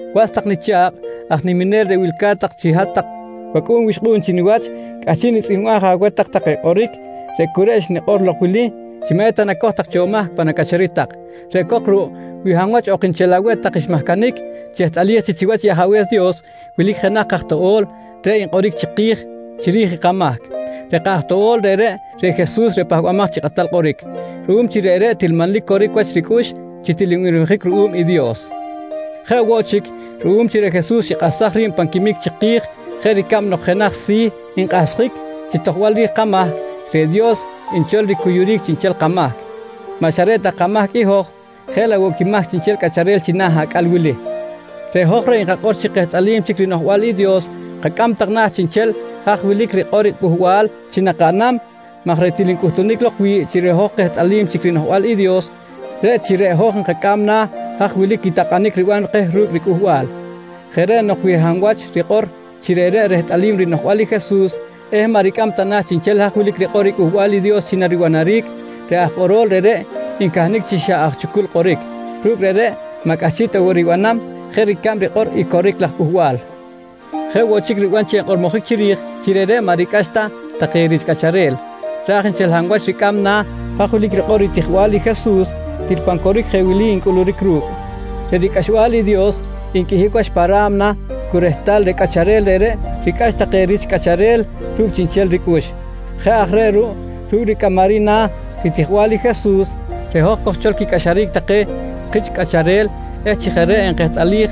Was tak nicha̱kꞌ aj niminel reꞌ wilca̱t tak chi jeꞌ hat-tak wacꞌu̱n wixkꞌu̱n chi niwach, cꞌahchiꞌ nitzꞌihmbam je aweh tak take kꞌoric reꞌ cu reꞌ xnikꞌor lok wili chi maꞌ eta nacoj tak cho mahc pan acꞌacharic tak. Reꞌ cok ruꞌ wi hab wach ok nchel aweh tak xmahcanic, chehtꞌalij chi chiwach i Ajabe̱s Dios wilic jenaj kaj toꞌo̱l reꞌ nkꞌoric chiki̱j chiri̱j i kamahc. Reꞌ kaj toꞌo̱l reꞌreꞌ, reꞌ i Jesus reꞌ Pahbamaj chi Kꞌatal Kꞌoric. Ruꞌum chi reꞌreꞌ til manlic coric wach ricꞌux, til nbirmijic ruꞌum i Dios. Jeꞌ woꞌ chic ruꞌum chi reꞌ Jesus xikꞌahsaj ri̱b pan quimic chiki̱j jeꞌ ricab nok jenaj si̱ nkꞌahsjic chi tojbal ri̱j kamahc, reꞌ Dios nchol ricuyuric chiꞌnchel kamahc. Maꞌ xa reꞌ ta kamahc i hoj jeꞌ laꞌ woꞌ quimahc chiꞌnchel cꞌacharel china̱ acꞌal wili. Reꞌ hoj reꞌ nkakꞌor chi kehtꞌalim chic rinoꞌjbal i Dios kacꞌam tak na̱ chiꞌnchel haj wilic rikꞌor riCꞌuhbal chi nakaꞌnam maj reꞌ til ncꞌuhtunic lok wi̱ꞌ chi reꞌ hoj kehtꞌalim chic rinoꞌjbal i Dios, reꞌ chi reꞌ hoj nkacꞌam na̱ haj wilic i takꞌanic riban keh ru̱cꞌ riCꞌuhbal. Jeꞌ reꞌ nok wi hab wach rikꞌor chi reꞌreꞌ rehtꞌalim rinoꞌjbal i Jesus eh maꞌ ricꞌam ta na̱ chiꞌnchel haj wilic rikꞌor riCꞌuhbal i Dios chi naribanaric, reꞌ aj kꞌorol reꞌreꞌ ncahnic chi xa aj chucul kꞌoric. Ru̱cꞌ reꞌreꞌ maꞌ cꞌahchiꞌ ta woꞌ ribanam jeꞌ ricab rikꞌor i coric laj cꞌuhbal. Jeꞌ woꞌ chic riban chi enkꞌormojic chiri̱j chi reꞌreꞌ maꞌ ricꞌax ta take rich cꞌacharel. Raj nchel hab wach ricꞌam na̱ haj wilic rikꞌor ritijbal i Jesus, til pan coric jeꞌ wili ncꞌuluric ru̱cꞌ: Reꞌ ricꞌaxbal i Dios nqꞌuihic wach pa ra̱mna cu rehtal reꞌ cꞌacharel reꞌreꞌ ricꞌax take rich cꞌacharel ru̱cꞌ chiꞌnchel ricꞌux. Jeꞌ aj reꞌ ruꞌ ru̱cꞌ ricꞌamaric na̱ ritijbal i Jesus, reꞌ hoj kojchol quicꞌaxaric take kich cꞌacharel eh chi jeꞌ reꞌ nkehtꞌalij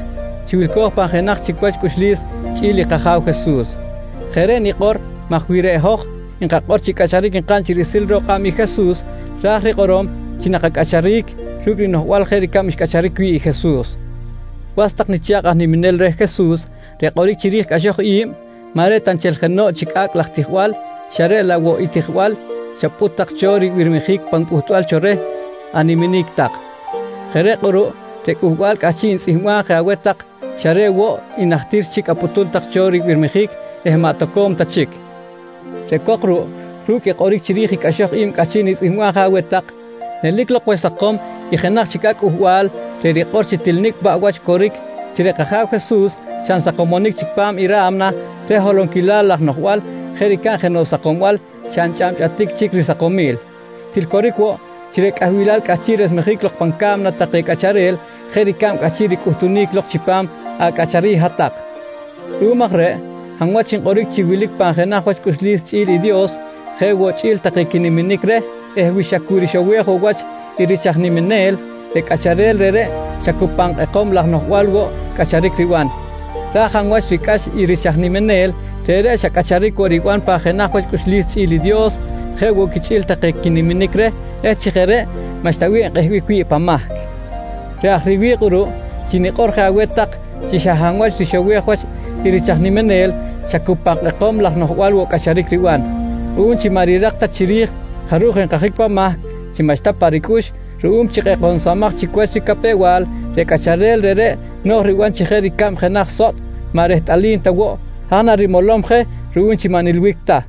chi wilco̱j pan jenaj chic wach cꞌuxlis chꞌi̱l i kAja̱w Jesus. Jeꞌ reꞌ nikꞌor maj wi reꞌ hoj nkakꞌor chi cꞌacharic nkaꞌn chi riꞌsil ro̱k kꞌab i Jesus, ra̱j rikꞌorom chi nakacꞌacharic ru̱cꞌ rinoꞌjbal jeꞌ ricab xcꞌacharic wi̱ꞌ i Jesus. Was tak nicha̱kꞌ aj niminel reh Jesus, reꞌ kꞌoric chiri̱j cꞌaxoj i̱b maꞌ reꞌ ta nchel jenoꞌ chic acꞌ laj tijbal, xa reꞌ laꞌ woꞌ i tijbal xapꞌut tak cho ribirmijic pan pꞌutbal cho reh animinic tak. Jeꞌ reꞌ kꞌuruꞌ reꞌ cꞌuhbal cꞌahchiꞌ nitzꞌihmbam je aweh tak xa reꞌ woꞌ i najtir chic apꞌutum tak cho ribirmijic eh maꞌ toco̱m ta chic. Reꞌ cok ruꞌ, ru̱cꞌ i kꞌoric chiri̱j i cꞌaxoj i̱b cꞌahchiꞌ nitzꞌihmbam je aweh tak nelic lok wach sakom i jenaj chic acꞌ cꞌuhbal reꞌ rikꞌor chi til nicꞌ paꞌ wach coric chi reꞌ kAja̱w Jesus xa nsakomonic chic pa̱m i ra̱mna reh holonquilal laj noꞌjbal jeꞌ ricab nok jenoꞌ sakombal xa nchꞌabchꞌatic chic risakomil. Til coric woꞌ chi reꞌ cꞌahbilal cꞌahchiꞌ chic resmejic lok pan ca̱mna take cꞌacharel jeꞌ ricab cꞌahchiꞌ ricꞌuhtunic lok chipam acꞌacharic hat-tak. Ruꞌum aj reꞌ, hab wach nkꞌoric chi wilic pan jenaj wach cꞌuxlis chꞌi̱l i Dios jeꞌ woꞌ quichꞌi̱l take quiniminic reh eh wi xa cu rixowej woꞌ wach i rich aj niminel, reꞌ cꞌacharel reꞌreꞌ xa cu pan kꞌekom laj noꞌjbal woꞌ cꞌacharic riban. Raj hab wach ricꞌax i rich aj niminel, reꞌreꞌ xa cꞌacharic woꞌ riban pan jenaj wach cꞌuxlis chꞌi̱l i Dios jeꞌ woꞌ quichꞌi̱l take quiniminic reh eh chi jeꞌ reꞌ maꞌxta bih enkꞌehbic wi̱ꞌ pan mahc. Reꞌ aj reꞌ riwi̱ꞌ kꞌuruꞌ chi nikꞌor je aweh tak chi xa hab wach rixowej wach i rich aj niminel xa cu pan kꞌekom laj noꞌjbal woꞌ cꞌacharic riban. Ruꞌum chi maꞌ rirak ta chic chiri̱j jaruj enkajic pan mahc chi xa maꞌxta pa ricꞌux ruꞌum chi kꞌekomsamaj chic wach ricapew-bal, reꞌ cꞌacharel reꞌreꞌ no̱j riban chi jeꞌ ricab jenaj sotꞌ maꞌ rehtꞌalim ta woꞌ haj narimolom je ruꞌum chi maꞌ nilbic ta.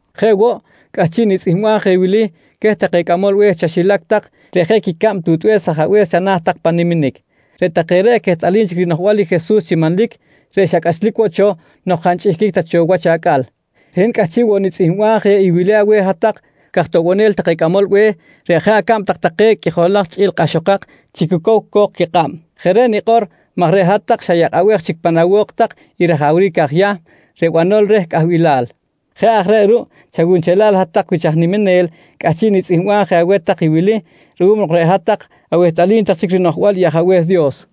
Jeꞌ woꞌ cꞌahchiꞌ nitzꞌihmbam je wili queh take cꞌamol be̱h chaxilac tak reꞌ jeꞌ quicab tutbe̱s ajabe̱s chana̱ tak pan niminic. Reꞌ take reꞌ quehtꞌalim chic rinoꞌjbal i Jesus chi manlic reꞌ xa cꞌachlic woꞌ cho nok jaꞌ nchꞌihquic ta cho wach acꞌal. Reꞌ hin cꞌahchiꞌ woꞌ nitzꞌihmbam je i wili aweh hat-tak caj toꞌbonel take cꞌamol be̱h reꞌ jeꞌ acab tak take qꞌuijolak chꞌi̱l kꞌahxokak chi cu cow co̱k quikꞌab. Jeꞌ reꞌ nikꞌor maj reꞌ hat-tak xayakꞌabej chic pan awo̱k tak i rajawric aj Yahm reꞌ banol reh cꞌahbilal. Jeꞌ aj reꞌ ruꞌ chawunchelal hat-tak wich aj niminel, cꞌahchiꞌ nitzꞌihmbam je aweh tak i wili ruꞌum nok reꞌ hat-tak awehtꞌalim tak chic rinoꞌjbal i Ajabe̱s Dios.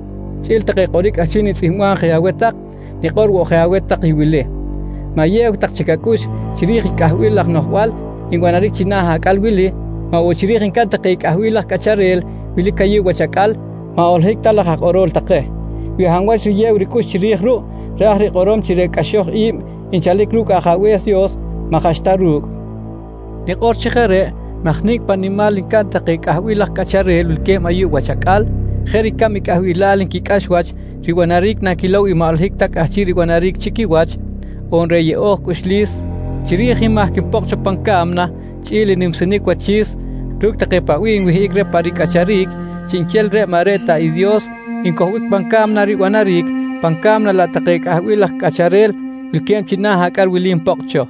Chꞌi̱l take kꞌoric cꞌahchiꞌ nitzꞌihmbam je aweh tak, nikꞌor woꞌ je aweh tak i wili: Ma̱yew tak chic acꞌux chiri̱j i cꞌahbil laj noꞌjbal nbanaric china̱ acꞌal wili, maꞌ woꞌ chiri̱j ncaꞌn take i cꞌahbil laj cꞌacharel wilic ayuꞌ wach acꞌal maꞌ holohic ta laj aj kꞌorol take. Wi hab wach riyew ricꞌux chiri̱j ruꞌ ra̱j rikꞌorom chi reꞌ cꞌaxoj i̱b nchalic ru̱cꞌ Ajabe̱s Dios maꞌ jaꞌxta ru̱cꞌ. Nikꞌor chi jeꞌ reꞌ maj nicꞌ paꞌ nimal ncaꞌn take cꞌahbil laj cꞌacharel wilque̱b ayuꞌ wach acꞌal, jeꞌ ricab i cꞌahbilal nquicꞌax wach ribanaric nanquilow i maꞌ holohic ta cꞌahchiꞌ ribanaric chi quiwach, on reꞌ yeꞌo̱j cꞌuxlis chiri̱j i mahc npokꞌ cho pan ca̱mna chꞌi̱l i nimsinic wachi̱s ru̱cꞌ take paꞌ bih nwihꞌic reh pa ricꞌacharic, chiꞌnchel reꞌreꞌ maꞌ reꞌ ta Dios ncojbic pan ca̱mna ribanaric, pan ca̱mna laꞌ take cꞌahbil laj cꞌacharel wilque̱b china̱ acꞌal wili npokꞌ cho.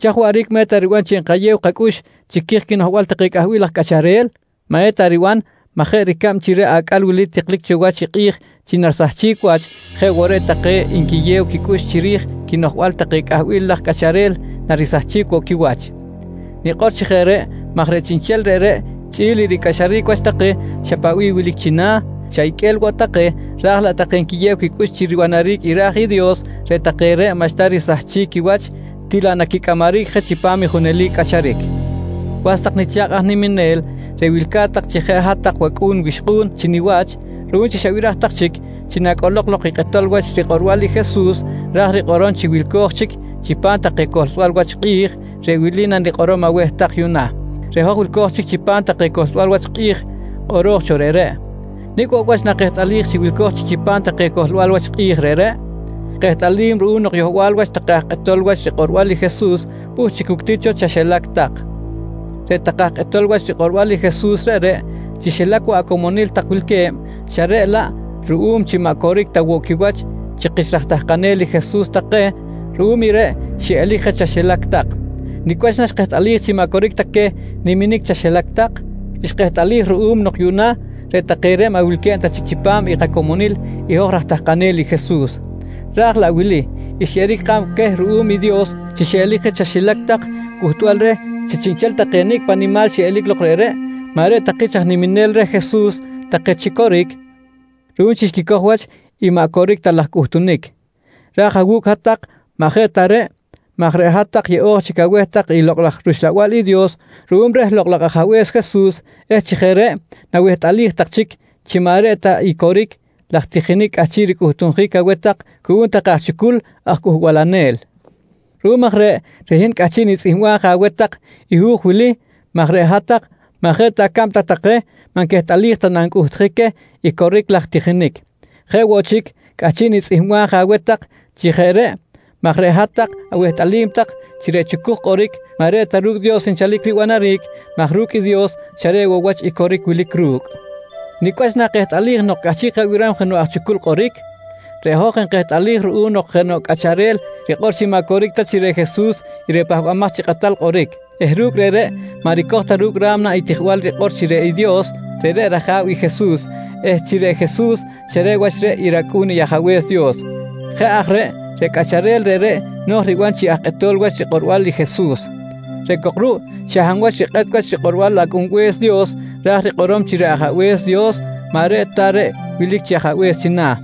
Chaj waꞌric maꞌ eta riban chi enkayew kacꞌux chiri̱j quinoꞌjbal take cꞌahbil laj cꞌacharel? Maꞌeta riban maj jeꞌ ricab chi reꞌ acꞌal wili tiklic cho wach i kꞌi̱j chi narisahchic wach, jeꞌ woꞌ reꞌ take nquiyew quicꞌux chiri̱j quinoꞌjbal take cꞌahbil laj cꞌacharel narisacharic woꞌ quiwach. Nikꞌor chi jeꞌ reꞌ maj chiꞌnchel reꞌreꞌ chꞌi̱l i ricꞌaxaric wach take xa paꞌ bih wilic china̱, xa iqꞌue̱l woꞌ take raj laꞌ take nquiyew quicꞌux chi ribanaric i ra̱j i Dios reꞌ take reꞌ maꞌxta risahchic quiwach til laꞌ naquicꞌamaric je chipam i junelic cꞌacharic. Was tak nicha̱kꞌ aj niminel reꞌ wilca̱t tak chi jeꞌ hat-tak wacꞌu̱n wixkꞌu̱n chi niwach, ruꞌum chi xabiraj tak chic chi nacꞌolok lok i kꞌetol wach rikꞌorbal i Jesus ra̱j rikꞌorom chi wilco̱j chic chipam take cohlsbal wach kꞌi̱j, reꞌ wili nanikꞌorom aweh tak yuꞌna: Reꞌ hoj wilco̱j chic chipam take cohlsbal wach kꞌi̱j kꞌoro̱j cho reꞌreꞌ. Nicꞌ woꞌ wach nakehtꞌalij chi wilco̱j chic chipam take cohlsbal wach kꞌi̱j reꞌreꞌ? Kehtꞌalim ruꞌum nok yohbal wach take aj kꞌetol wach rikꞌorbal i Jesus pꞌuht chic cuctic cho chaxilac tak. Reꞌ take aj kꞌetol wach rikꞌorbal i Jesus reꞌreꞌ, chi xilac woꞌ nak acomonil tak wilque̱b xa reꞌ laꞌ ruꞌum chi maꞌ coric ta woꞌ quiwach chi kich raj tahkanel i Jesus take ruꞌum i reꞌ xiꞌelic je chaxilac tak. Nicꞌ wach naxkehtꞌalij chi maꞌ coric ta queh niminic chaxilac tak? Xkehtꞌalij ruꞌum nok yuꞌna reꞌ take reꞌ maꞌ wilque̱b ta chic chipam i kacomonil i hoj raj tahkanel i Jesus. Raj laꞌ wili xyeꞌeric kꞌab queh ruꞌum i Dios chi xiꞌelic je chaxilac tak cꞌuhtbal reh chi chiꞌnchel take nicꞌ nimal xiꞌelic lok reꞌreꞌ maꞌ reꞌ ta kich aj niminel reh Jesus take chi coric ruꞌum chi xquicoj wach i maꞌ coric ta laj cꞌuhtunic. Raj awu̱cꞌ hat-tak maꞌ jeꞌ ta reꞌ maj reꞌ hat-tak yeꞌo̱j chic aweh tak i Lokꞌ laj rUxlabal i Dios ruꞌum reh Lokꞌ laj Ajabe̱s Jesus eh chi jeꞌ reꞌ nawehtꞌalij tak chic chi maꞌ reꞌ ta i coric laj tijinic cꞌahchiꞌ ricꞌuhtjic aweh tak cuꞌum take aj chucuj aj cꞌuhbalanel. Ruꞌum aj reꞌ, reꞌ hin cꞌahchiꞌ nitzꞌihmbam je aweh tak i hu̱j wili maj reꞌ hat-tak maꞌ jeꞌ ta acab tak take maꞌ nquehtꞌalij ta na ncꞌuhtjic queh i coric laj tijinic. Jeꞌ woꞌ chic cꞌahchiꞌ nitzꞌihmbam je aweh tak chi jeꞌ reꞌ maj reꞌ hat-tak awehtꞌalim tak chi reꞌ chucuj kꞌoric maꞌ reꞌ ta ru̱cꞌ i Dios nchalic ribanaric maj ru̱cꞌ i Dios xa reꞌ wach i coric wilic ru̱cꞌ! Nicꞌ wach nakehtꞌalij nok cꞌahchiꞌ kabiram jenoꞌ aj chucul kꞌoric? Reꞌ hoj nkehtꞌalij ruꞌ nok jenoꞌ cꞌacharel rikꞌor chi maꞌ coric ta chi reꞌ Jesus reꞌ i Pahbamaj chi Kꞌatal Kꞌoric eh ru̱cꞌ reꞌreꞌ maꞌ ricoj ta ru̱cꞌ ra̱mna i tijbal rikꞌor chi reꞌ Dios, reꞌreꞌ rAja̱w i Jesus eh chi reꞌ Jesus xa reꞌ wach reꞌ i rAcꞌu̱n i Ajabe̱s Dios. Jeꞌ aj reꞌ, reꞌ cꞌacharel reꞌreꞌ no̱j riban chi aj kꞌetol wach rikꞌorbal i Jesus. Reꞌ cok ruꞌ xa hab wach rikꞌet wach rikꞌorbal Acꞌunbe̱s Dios ra̱j rikꞌorom chi reꞌ Ajabe̱s Dios maꞌ reꞌ ta reꞌ wilic chi Ajabe̱s china̱.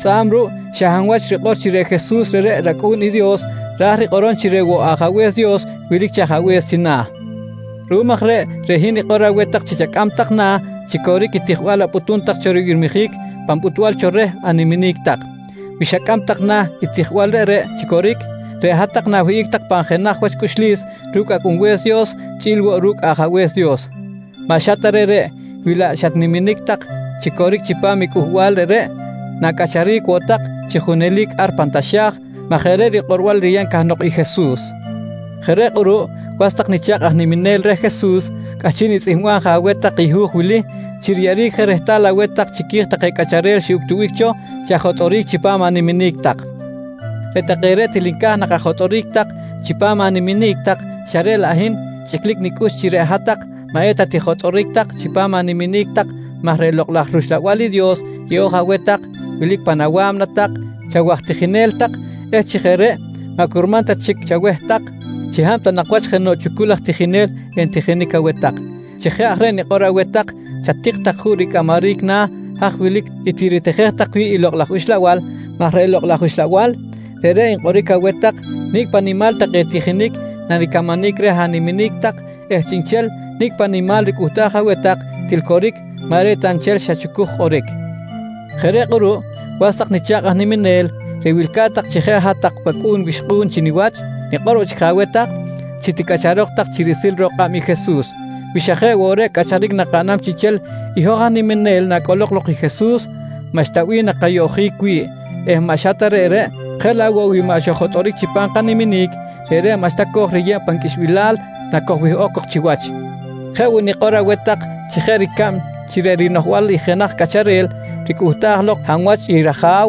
Tzꞌa̱b ruꞌ xa hab wach rikꞌor chi reꞌ Jesus reꞌreꞌ rAcꞌu̱n i Dios ra̱j rikꞌorom chi reꞌ woꞌ Ajabe̱s Dios wilic chi Ajabe̱s china̱. Ruꞌum aj reꞌ, reꞌ hin nikꞌor je aweh tak chi chacꞌam tak na̱ chi coric i tijbal apꞌutum tak cho ribirmijic pan pꞌutbal cho reh animinic tak. Wi xacꞌam tak na̱ i tijbal reꞌreꞌ chi coric, reꞌ hat-tak na̱wihꞌic tak pan jenaj wach cꞌuxlis ru̱cꞌ Acꞌunbe̱s Dios chꞌi̱l woꞌ ru̱cꞌ Ajabe̱s Dios. Maꞌ xa ta reꞌreꞌ, wi laꞌ xatniminic tak chi coric chipam i cꞌuhbal reꞌreꞌ na̱cꞌacharic woꞌ tak chi junelic ar pan taxa̱j maj jeꞌ reꞌ rikꞌorbal riyeb cahnok i Jesus. Jeꞌ reꞌ kꞌuruꞌ was tak nicha̱kꞌ aj niminel reh Jesus, cꞌahchiꞌ nitzꞌihmbam je aweh tak i hu̱j wili chi riyeꞌeric je rehtal aweh tak chiqui̱j take cꞌacharel xiꞌuctubic cho chi ajotꞌoric chipam animinic tak. Reꞌ take reꞌ til nca̱j nak ajotꞌoric chipam animinic tak xa reꞌ laꞌ hin chꞌiclic nicꞌux chi reꞌ hat-tak maꞌ eta tijotꞌoric tak chipam animinic tak maj reꞌ Lokꞌ laj rUxlabal i Dios yeꞌo̱j aweh tak wilic pan awa̱mna tak chi awaj tijinel tak eh chi jeꞌ reꞌ maꞌ curman ta chic chaweh tak chi hab ta nak wach jenoꞌ chucul aj tijinel entijinic aweh tak. Chi jeꞌ aj reꞌ nikꞌor je aweh tak, chatik tak juꞌ ricꞌamaric na̱ haj wilic i tiritijej tak wi̱ꞌ i Lokꞌ laj Uxlabal maj reꞌ Lokꞌ laj Uxlabal, reꞌreꞌ nkꞌoric aweh tak nicꞌ paꞌ nimal take tijinic naricamanic reh animinic tak eh chiꞌnchel nicꞌ paꞌ nimal ricꞌuhtaj aweh tak, til coric maꞌ reꞌ ta nchel xa chucuj kꞌoric. Jeꞌ reꞌ kꞌuruꞌ was tak nicha̱kꞌ aj niminel reꞌ wilca̱t tak chi jeꞌ hat-tak wacꞌu̱n wixkꞌu̱n chi niwach, nikꞌor woꞌ chic je aweh tak chi ticꞌacharok tak chi riꞌsil ro̱k kꞌab i Jesus. Wi xa jeꞌ woꞌ reꞌ cꞌacharic nakaꞌnam chiꞌnchel i hoj aj niminel nacꞌolok lok i Jesus, maꞌxta bih nakayoꞌjic wi̱ꞌ eh maꞌ xa ta reꞌreꞌ, jeꞌ laꞌ woꞌ wi maꞌ xoj-jotꞌoric chipam kaniminic, reꞌreꞌ maꞌxta kojriyeb pan qꞌuixbilal nakojwihꞌok cok chiwach. Jeꞌ woꞌ nikꞌor woꞌ aweh tak chi jeꞌ ricab chi reꞌ rinoꞌjbal i jenaj cꞌacharel ricꞌuhtaj lok hab wach i raja̱w,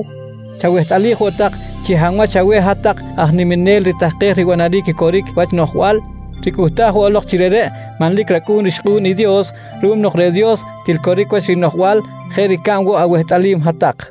chawehtꞌalij woꞌ tak chi xa hab wach aweh hat-tak aj niminel ritahkej ribanaric i coric wach noꞌjbal ricꞌuhtaj woꞌ lok chi reꞌreꞌ manlic racꞌu̱n rixkꞌu̱n i Dios ruꞌum nok reꞌ Dios til coric wach rinoꞌjbal jeꞌ ricab woꞌ awehtꞌalim hat-tak.